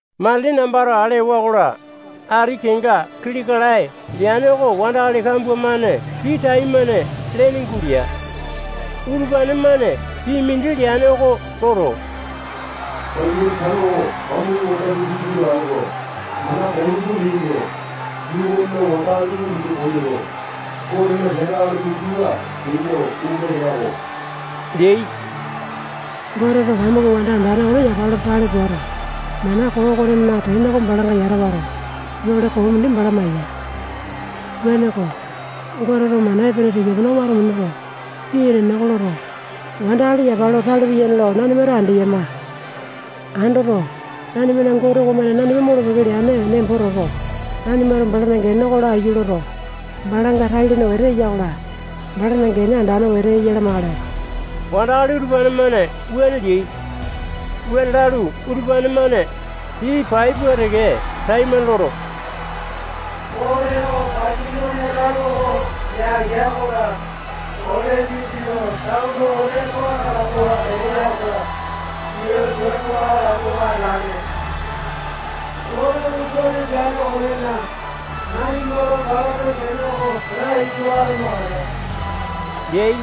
Matili nambato ale ewa-kola, ati kenga kili kalae leane oko wandakali kambua-mane pii taimane lene gulea. Utupane-mane pii mindi leane oko loto, Bapilone tano oko pamuku wanda mindi gulo atoto, mana koo tupa minuto, yuu okona wandakali tupa minu koyoto, Gotena piape akali minditupa peyo ome leako leai. Goteto pamuku wanda andane okone yapa lo tale puato, mana koo okonena tene oko balanga yata wato, yole koo mindi bala maya. Wuaneko, Goteto mana epene tika-pene oko wato minuto, pii enene oko loto, wandakali yapa lo tale piyane lo nanimato andeyama. Andoto, nanimana Gote okomane nanima molo-peke leane nembo toto, nanimato balana gene oko laiyu loto, balanga tai-lene wete eya-kola, balana gene andane wete eya lamakale. Wandakali utupane-mane wuane leai. Wuane lalu, utupane-mane pii pai pua teke taimane loto, Goteto Bapilone tano oko yangea-kola, ole dindi lo tano okone too atapo eya-kola, sia tua too atapowa atalane. Goteto wuane peane okonena, nanimato balana gene oko laiyu lo atamakale leai.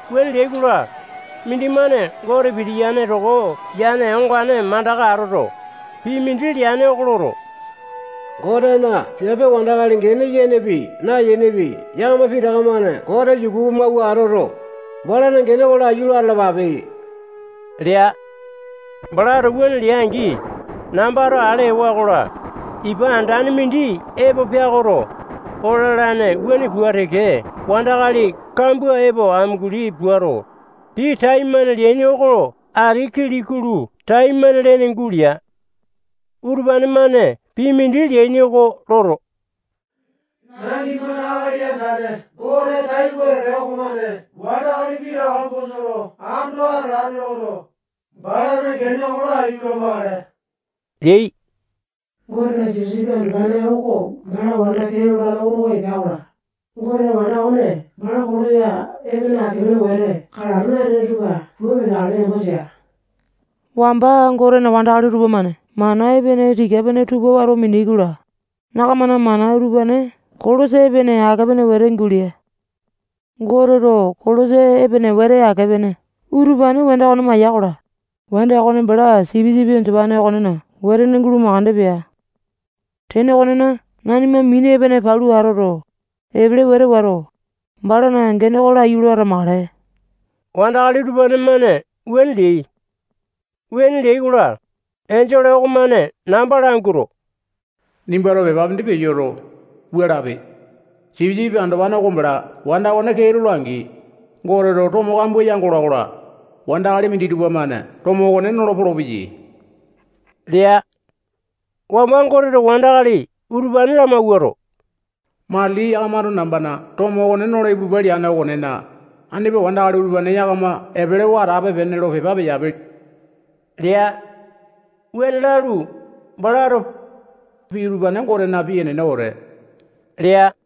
Wuane leai-kola, mindimane Gote pitiyane toko yane ongane mandaka atoto, pii mindi leane oko loto, Gotena piape wandakali gene yenepi, nayenepi, yakama pitaka-mane Gote yuku amawuato atoto, balana gene oko laiyu lo atalapape lea. Balato wuane lea-angi, nambato ale ewa-kola, ipa andane mindi epo peakoto, oo lalane wuane pua teke wandakali kambua epo amunguli puato, pii taimane leaini oko ati kili-kulu taimane lene gulea. Utupane-mane pii mindi leaini oko loto, nanimana Akali Andane Gote tai wetete okomane wandakali pitaka bosa lo ando atalane loto, balana gene oko laiyu lamakale leai. Gotena Sipisipi Andopane oko bala wanda kee lolane oto oko epea-kola, Goteto wanda okone bala kolosa epene ake-pene wete kalato natene tupa pua peteakale nembo tea. Wamba Gotena wandakali tupamane mana epene tika-pene tupa wato mineai-kola, yakamana mana utupane kolosa epene ake-pene wete gulea. Goteto kolosa epene wete ake-pene utupane wanda okone maya-kola, wanda okone bala Sipisipi Andopane okonena wetene gulo makande pea. Tene okonena, nanima mini epene palu atoto, epele wete wato, balana gene oko laiyu lo atamakale. Wandakali utupane-mane wuane leai. Wuane leai-kola, enjole okomane namba languato, nimbato pepa mindi peyoto, wua lape: Sipisipi Andopane oko bala wanda okone kee lola-angi, Goteto tomo kambua yangola-kola, wandakali minditupa-mane tomo okone nolo polopeyai lea. Wamba Goteto wandakali utupane lamawuato, matili yakamato nambana tomo okone nolo ipulupale leane okonena, andipa wandakali utupane yakama epelewa atape-pene lo pepa peyape lea. Wuane lalu, balato pii utupane Gotena pii enene wete lea.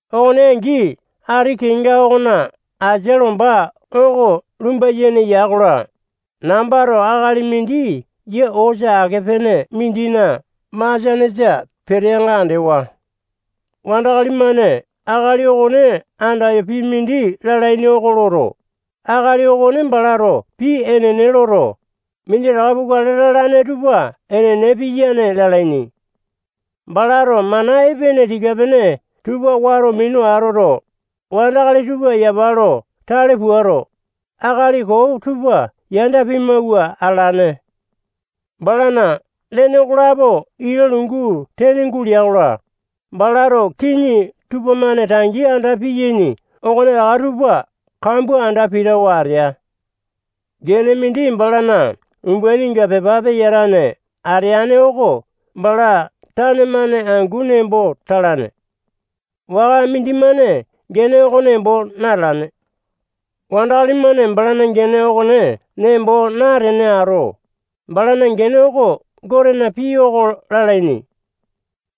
Okone angi, ati kenga okona asia lomba oko lumba-yene ya-kola, nambato akali mindi yia osa ake-pene mindina masianesa peteanga andewa. Wandakali-mane akali okone andayo pii mindi lalaini oko loto, akali okone balato pii enene loto, minditaka pukale lalane tupa enene piyane lalaini. Balato mana epene tika-pene tupa wato minu atoto, wandakali tupa yapa lo tale puato, akali koo tupa yanda pimawua atalane. Balana lene okolapo ita lungu tene gulea-kola, balato kiŋi tupamane tangi anda piyaini okonetaka tupa kambua anda pitawa atea. Gene mindi balana umbaininga pepa peyatane ateane oko bala tane-mane angu nembo talane. Waka mindimane gene oko nembo natalane. Wandakali-mane balana gene okone nembo natene ato, balana gene oko Gotena Pii Oko lalaini.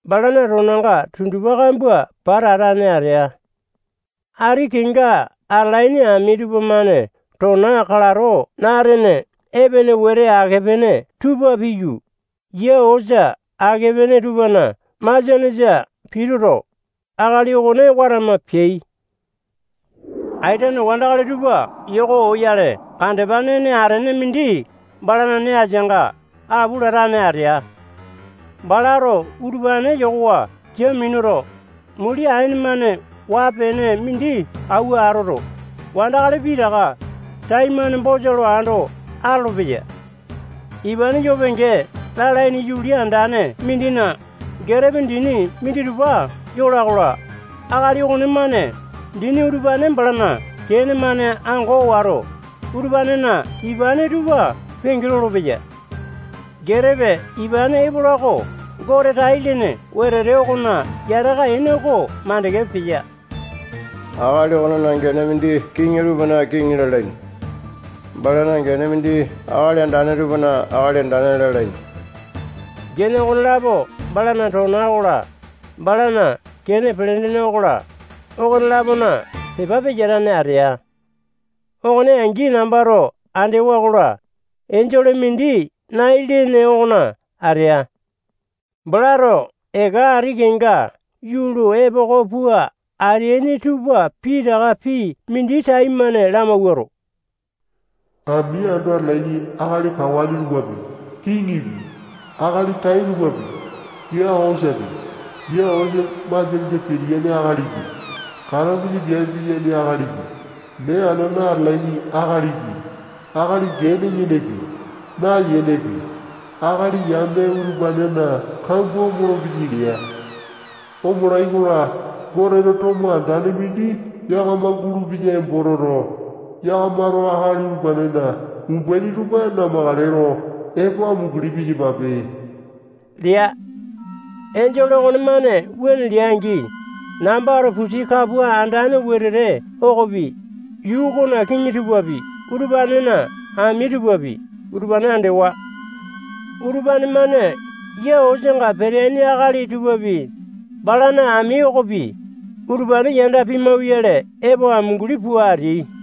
Balana tonanga tundupa kambua pata atane atea. Ati kenga atalaini ami tupamane tona kalato natene epene wete ake-pene tupa piyu, yia osa ake-pene tupana masianesa pituto, akali okone watama peai. Aitene wandakali tupa yoko oyale kandepa nene atene mindi balana nee asianga apu latane atea. Balato utupane yokowa sia minuto, muli aene-mane waa-pene mindi auwa atoto, wandakali pitaka taimane bosa lo ando atolopeya. Ipane yoo penge lalaini yuli andane mindina getepe dini minditupa yola-kola, akali okonemane dini utupane balana kene-mane ango wato, utupanena ipane tupa penge lolopeya. Getepe ipane epola oko Gote tai-lene wetete okona yataka ene oko makande peya. Akali okonena gene mindi kiŋi tupana kiŋi lalaini. Balana gene mindi akali andane tupana Akali Andane lalaini. Gene okonelapo balana tona okola, balana kene pelendene okola, okone-lapona pepa peyatane atea. Okone angi, nambato andewa-kola, enjole mindi nai lene okona atea. Balato eka ati kenga yuu lo epoko pua ateaini tupa pitaka pii mindi taimane lamawuato, ami ando atalaini akali kawane tupapi, kiŋipi, akali tai tupapi, yia osapi, yia osa masianesa pitiyane akalipi, katapusa piape piyaini akalipi, mee anana atalaini akalipi, akali gene yenepi, nayenepi, akali yame utupanena kambua omolo-peyai lea. Omolai-kola, Goteto tomo andane mindi yakama gulupeya nembo toto, yakamato akali utupanena umbaini tupa namakale lo epo amunguli piyapape lea. Enjole okonemane wuane lea-angi, nambato pusi kapua andane wetete okopi, yuu okona kiŋi tupapi, utupanena ami tupapi, utupane andewa. Utupane-mane yia osanga peteane akali tupapi, balana ami okopi, utupane yanda pimauyale epo amunguli pua ateai.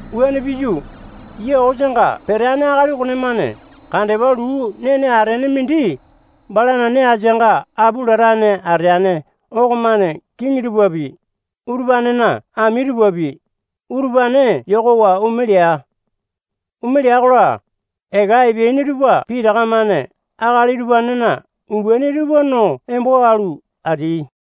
Wuane piyu, yia osanga peteane akali okonemane kandepa luu nene atene mindi balana nee asianga apu latane ateane okomane kiŋi tupapi, utupanena ami tupapi, utupane yokowa ome lea. Omeai-kola, eka epeaini tupa pitaka-mane akali utupanena umbaini tupa no embo alu, ateai.